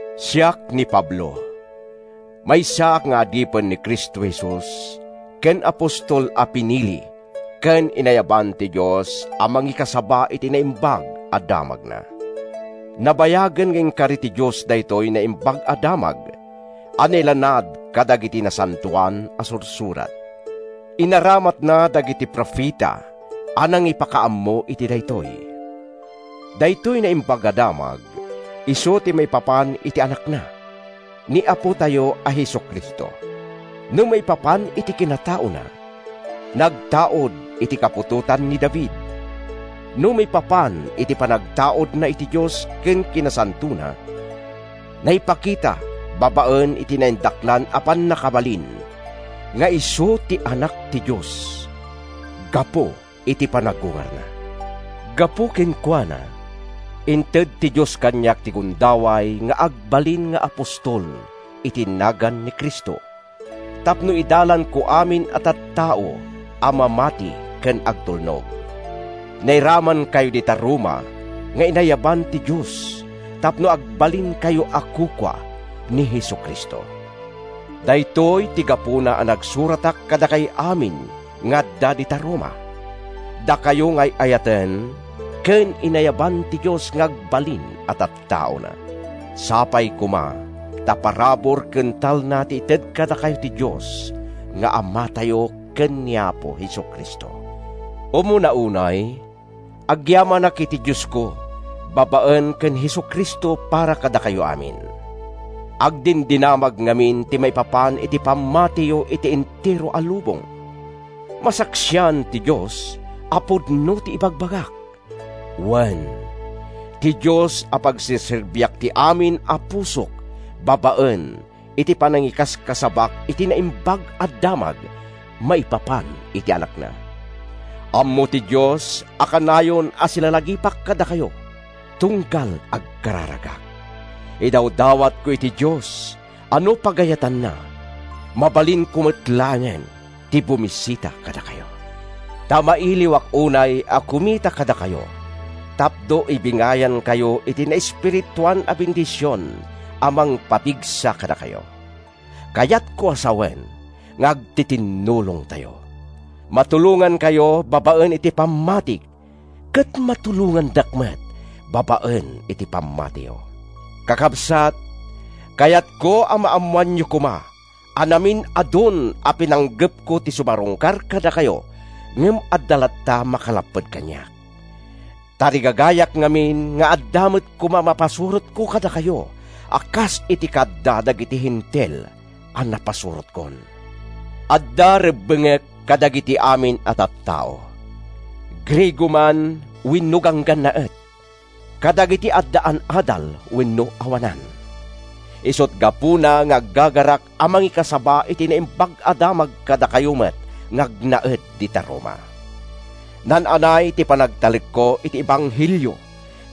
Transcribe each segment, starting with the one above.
Siak ni Pablo. Maysaak nga adipen ni Cristo Jesus ken apostol a pinili ken inayaban ti Dios a mangikasaba iti Naimbag a Damagna. Nabayagen nga inkari ti Dios daytoy Naimbag a Damag a nailanad kadagiti Nasantoan a Sursurat. Inaramatna dagiti profeta a nangipakaammo iti daytoy. Daytoy Naimbag a Damag isu ti maipapan iti Anakna, ni Apotayo a Jesu-Cristo. No maipa-pan iti kinataona, nagtaud iti kaputotan ni David; no maipapan iti panagtaudna iti Dios ken kinasantona, naipakita babaen iti naindaklan a pannakabalin nga isu ti Anak ti Dios gapu iti panagungarna. Gapu kenkuana, inted ti Dios kaniak ti gunda-way nga agbalin nga apostol iti nagan ni Cristo, tapno idalanko amin a tattao a mamati ken agtulnog. Nairamankayo dita Roma nga inayaban ti Dios tapno agbalinkayo a kukua ni Jesu-Cristo. Daytoy ti gapuna a nagsuratak kadakay amin nga adda dita Roma, dakayo nga ay-ayaten ken inayaban ti Dios nga agbalin a tattaona. Sapay koma ta parabur ken talna ti ited kadakayo ti Dios nga Amatayo ken ni Apo Jesu-Cristo. Umuna unay, agyamanak iti Diosko babaen ken ni Jesu-Cristo para kadakayo amin. Agdindinamag ngamin ti maipapan iti pammatiyo iti entero a lubong. Masaksian ti Dios a pudno ti ibagbagak; wen, ti Dios a pagserserbiak iti amin a pusok babaen iti panangikaskasabak iti Naimbag a Damag maipapan iti Anakna. Ammo ti Dios a kanayon a silalagipak kadakayo tunggal agkararagak. Idawdawatko iti Dios a no pagayatanna, mabalinko met laengen ti bumisita kadakayo. Ta mailiwak unay a kumita kadakayo tapno ibingayankay iti naespirituan a bendision a mangpapigsa kadakayo. Kayatko a sawen nga agtitinnulongtayo: matulongankayo babaen iti pammatik ket matulongandak met babaen iti pammatiyo. Kakabsat, kayatko a maammoanyo koma a namin-adun a pinanggepko ti sumarungkar kadakayo ngem adda latta maka-lapped kaniak. Tarigagayak ngamin nga adda met koma mapasurotko kadakayo a kas iti kaadda dagiti Hentil a napasurotkon. Adda rebbengek kadagiti amin a tattao, Griego man wenno ganggannaet, kadagiti addaan adal wenno awanan. Isut’ gapuna nga aggagarak a mangikasaba iti Naimbag a Damag kadakayo met nga agnaed dita Roma. Naan-anay ti panagtalekko iti ebanghelio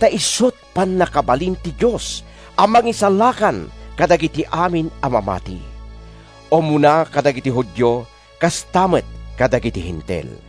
ta isut’ pannakabalin ti Dios a mangisalakan kadagiti amin a mamati, umuna kadagiti Judio kasta met kadagiti Hentil.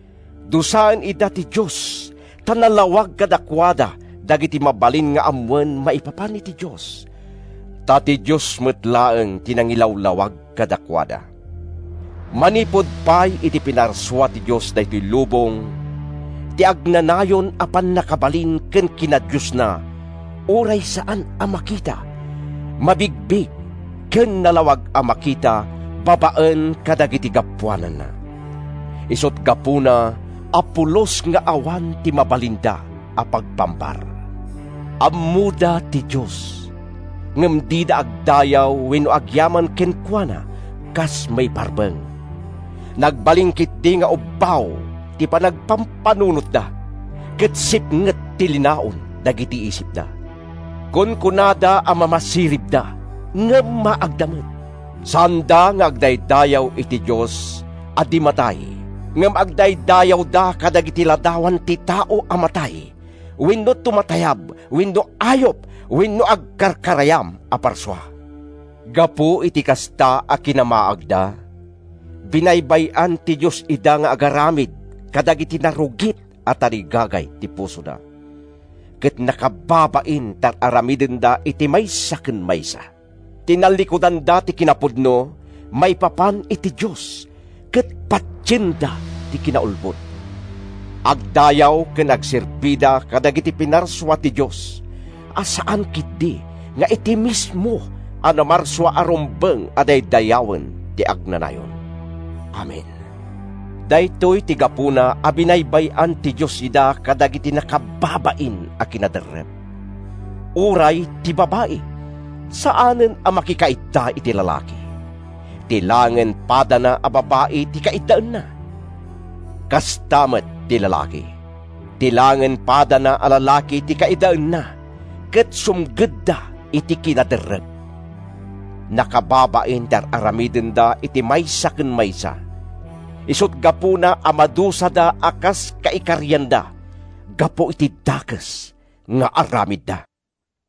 Dusaen ida ti Dios ta nalawag kadakuada dagiti mabalin nga ammoen maipapan iti Dios, ta ti Dios met laeng ti nangilawlawag kadakuada. Manipud pay idi pinarsua ti Dios daytoy lubong, ti agnanayon a pannakabalin ken kinadiosna, uray saan a makita, mabigbig ken nalawag a makita babaen kadagiti gapuananna. Isut’ gapuna a pulos nga awan ti mabalinda a pagpambar. Ammoda ti Dios, ngem dida agdayaw wenno agyaman kenkuana kas maiparbeng. Nagbalin ketdi nga ubbaw ti panagpampanunotda ket sipnget ti linaon dagiti isipda. Kunkunada a mamasiribda, ngem maagda met. Saanda nga agdaydayaw iti Dios a di matay, ngem agdaydayawda ketdi kadagiti ladawan ti tao a matay wenno tumatayab wenno ayup wenno agkarkarayam a parsua. Gapu iti kasta a kinamaagda, binaybay-an ti Dios ida nga agaramid kadagiti narugit a tarigagay ti pusoda, ket nakababain ti ar-aramidenda iti maysa ken maysa. Tinallikudanda ti kinapudno maipapan iti Dios ket patienda ti kinaulbod. Agdayaw ken agserbida kadagiti pinarsua ti Dios a saan ketdi nga iti mismo a Namarsua a rumbeng a daydayawen iti agnanayon! Amen. Daytoy ti gapuna a binaybay-an ti Dios ida kadagiti nakababain a kinaderrep. Uray ti babai, saanen a makikaidda iti lalaki. Ti laengen padana a babai ti kaiddaenna. Kasta met ti lalaki. Ti laengen padana a lalaki ti kaiddaenna ket sumgedda iti kinaderrep. Nakababain ti ar-aramidenda iti maysa ken maysa. Isut’ gapuna a madusada a kas kaikarianda gapu iti dakes nga aramidda.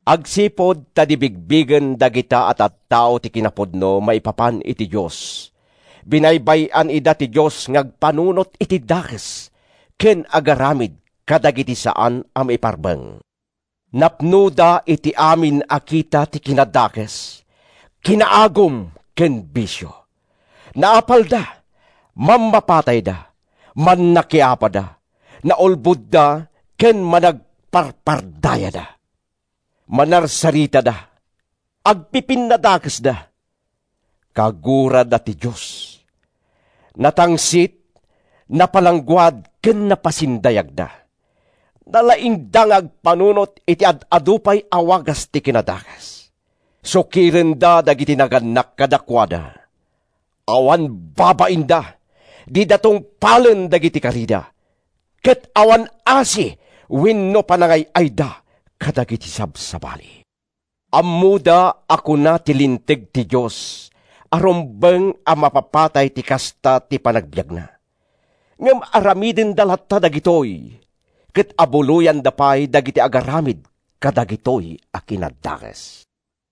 Agsipud ta di bigbigen dagita a tattao ti kinapudno maipapan iti Dios, binaybay-an ida ti Dios nga agpanunot iti dakes ken agaramid kadagiti saan a maiparbeng. Napnoda iti amin a kita ti kinadakes, kinaagum, ken bisio. Naapalda, mammapatayda, mannakiapada, naulbodda ken managparpardayada. Manarsaritada. Agpipinnadakesda. Kagurada ti Dios. Natangsit, napalangguad ken napasindayagda. Nalaingda nga agpanunot iti ad-adu pay a wagas ti kinadakes. Sukirenda dagiti nagannak kadakuada. Awan babainda. Dida tungpalen dagiti karida, ket awan asi wenno panangay-ayda kadagiti sabsabali. Ammoda a kuna ti linteg ti Dios a rumbeng a mapapatay ti kasta ti panagbiagna. Ngem aramidenda latta dagitoy ket abuloyanda pay dagiti agaramid kadagitoy a kinadakes.